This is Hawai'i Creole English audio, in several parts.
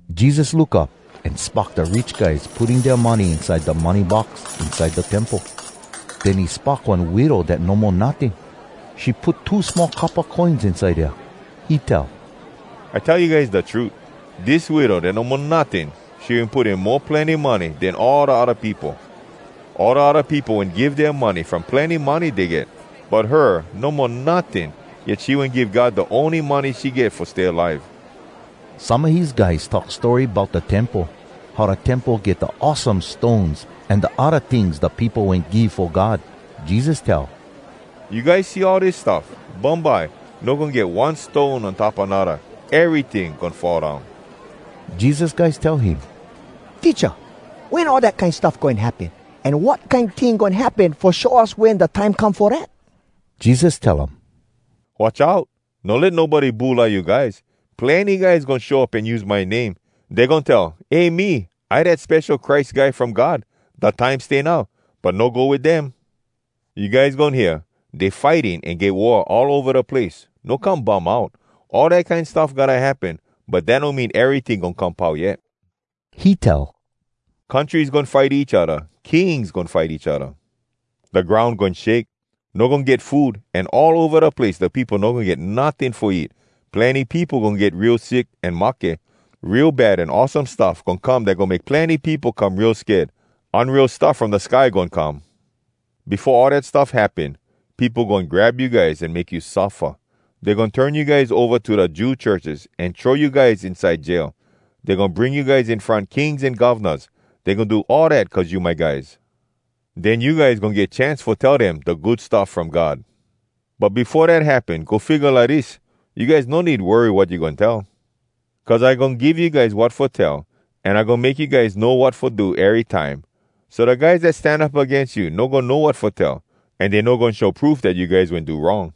Jesus look up an spock da rich guys putting dea money inside da money box inside da Temple. Den he spock one widow dat no mo notting. She put two small coppa coins inside dea. He tell, “I tell you guys da trut: Dis widow dat no mo notting, she wen put in mo plenny money den all da odda peopo. All da odda peopo wen give dea money from plenny money dey get. But her no mo notting, yet she wen give God da ony money she get fo stay alive.” Some a his guys talk story bout da Temple, how da Temple get da awesome stones an da odda tings da peopo wen give fo God. Jesus tell, “You guys see all dis stuff? Bumbye no goin get one stone on top anodda. Eryting goin fall down.” Jesus guys tell him, “Teacha, wen all dat kine stuff goin happen? An wat kine ting goin happen fo show us wen da time come fo dat?” Jesus tell um, “Watch out! No let nobody bulai you guys! Plenny guys goin show up an use my name. Dey goin tell, ‘Eh me, I dat Spesho Christ Guy from God! Da time stay now!’ But no go wit dem. You guys goin hear, ‘Dey fighting an get war all ova da place.’ No come bum out. All dat kine stuff gotta happen, but dat no mean eryting goin come pau yet.” He tell, “Countries goin fight each odda. Kings goin fight each odda. Da groun goin shake. No goin get food, an all ova da place da peopo no goin get notting fo eat. Plenny peopo goin get real sick an mahke. Real bad an awesome stuff goin come dat goin make plenny peopo come real sked. Unreal stuff from da sky goin come. “Befo all dat stuff happen, peopo goin grab you guys an make you suffa. Dey goin turn you guys ova to da Jew churches an throw you guys inside jail. Dey goin bring you guys in front kings an govnas. Dey goin do all dat cuz you my guys. Den you guys goin get chance fo tell dem da Good Stuff From God. “But befo dat happen, go figga lidis: You guys no need worry wat you goin tell. Cuz I goin give you guys wat fo tell, an I goin make you guys know wat fo do erytime, so da guys dat stan up agains you no goin know wat fo tell, an dey no goin show proof dat you guys wen do wrong.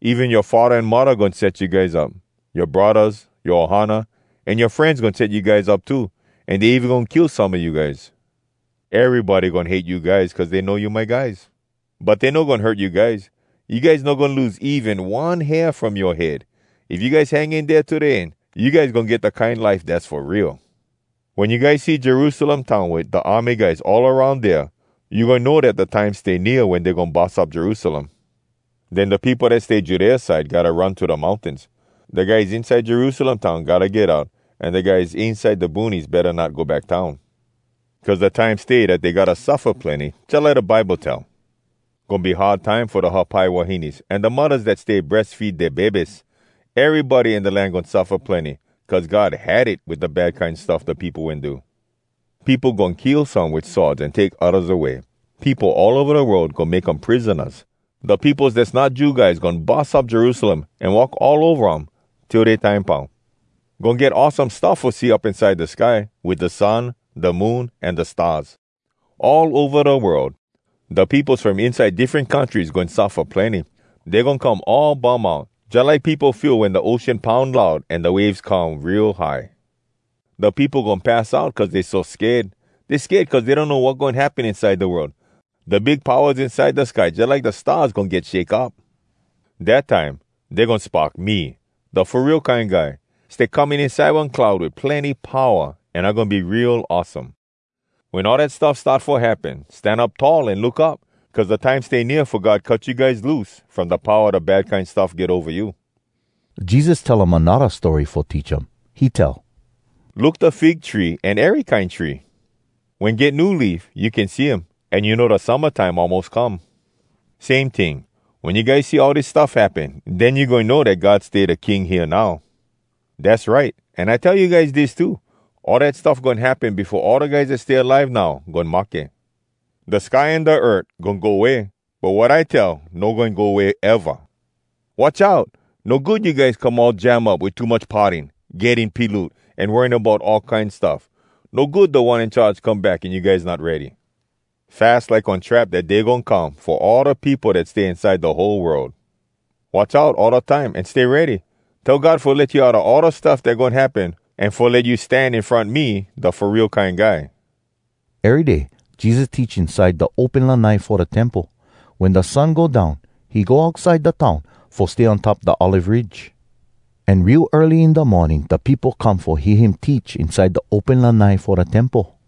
“Even yoa faddah an muddah goin set you guys up. Yoa braddahs, yoa ohana, an yoa frenz goin set you guys up too, an dey even goin kill some a you guys. Erybody goin hate you guys cuz dey know you my guys. But dey no goin hurt you guys. You guys no goin lose even one hair from yoa head! If you guys hang in dea to da end, you guys goin get da kine life dass fo real! “Wen you guys see Jerusalem town wit da army guys all aroun dea, you goin know dat da time stay nea wen dey goin bus up Jerusalem. Den da peopo dat stay Judea side gotta run to da mountains. Da guys inside Jerusalem town gotta get out, an da guys inside da boonies betta not go back town. Cuz da time stay dat dey gotta suffa plenny, jalike da Bible tell. Goin be hard time fo da hapai wahines an da muddahs dat stay breas feed dea bebes! Erybody in da land goin suffa plenny, cuz God had it wit da bad kine stuff da peopo wen do. Peopo goin kill some wit swords, an take oddas away. Peopo all ova da world goin make um prisonas. Da peopos dass not Jew guys goin bus up Jerusalem an walk all ova um, till dea time pau. “Goin get awesome stuff fo see up inside da sky, wit da sun, da moon, an da stars. All ova da world, da peopos from inside da diffren countries goin suffa plenny. Dey goin come all bum out, jalike peopo feel wen da ocean poun loud an da waves come real high. Da peopo goin pass out cuz dey so sked. Dey sked cuz dey donno wat goin happen inside da world. Da big powas inside da sky jalike da stars goin get shake up. Dat time dey goin spock me, da Fo Real Kine Guy, stay coming inside one cloud wit plenny powa, an I goin be real awesome. Wen all dat stuff start fo happen, stan up tall an look up. Cuz da time stay nea fo God cut you guys loose from da powa da bad kine stuff get ova you.” Jesus tell um anodda story fo teach um. He tell, “Look da fig tree an ery kine tree. Wen get new leaf, you can see um, an you know da summa time almos come. Same ting, wen you guys see all dis stuff happen, den you goin know dat God stay da King hea now. “Dass right! An I tell you guys dis too: All dat stuff goin happen befo all da guys dat stay alive now goin mahke. Da sky an da earth goin go way, but wat I tell no goin go way, eva. “Watch out! No good you guys come all jam up wit too much partying, getting piloot, an worrying bout all kine stuff. No good Da One In Charge come back, an you guys not ready. Fas like one trap dat day goin come fo all da peopo dat stay inside da whole world. Watch out all da time, an stay ready. Tell God fo let you get outa all da stuff dat goin happen, an fo let you stan in front me, da Fo Real Kine Guy.” Ery day Jesus teach inside da open lanai fo da Temple. Wen da sun go down, he go outside da town fo stay on top da Olive Ridge. An real early in da morning da peopo come fo hear him teach inside da open lanai fo da Temple.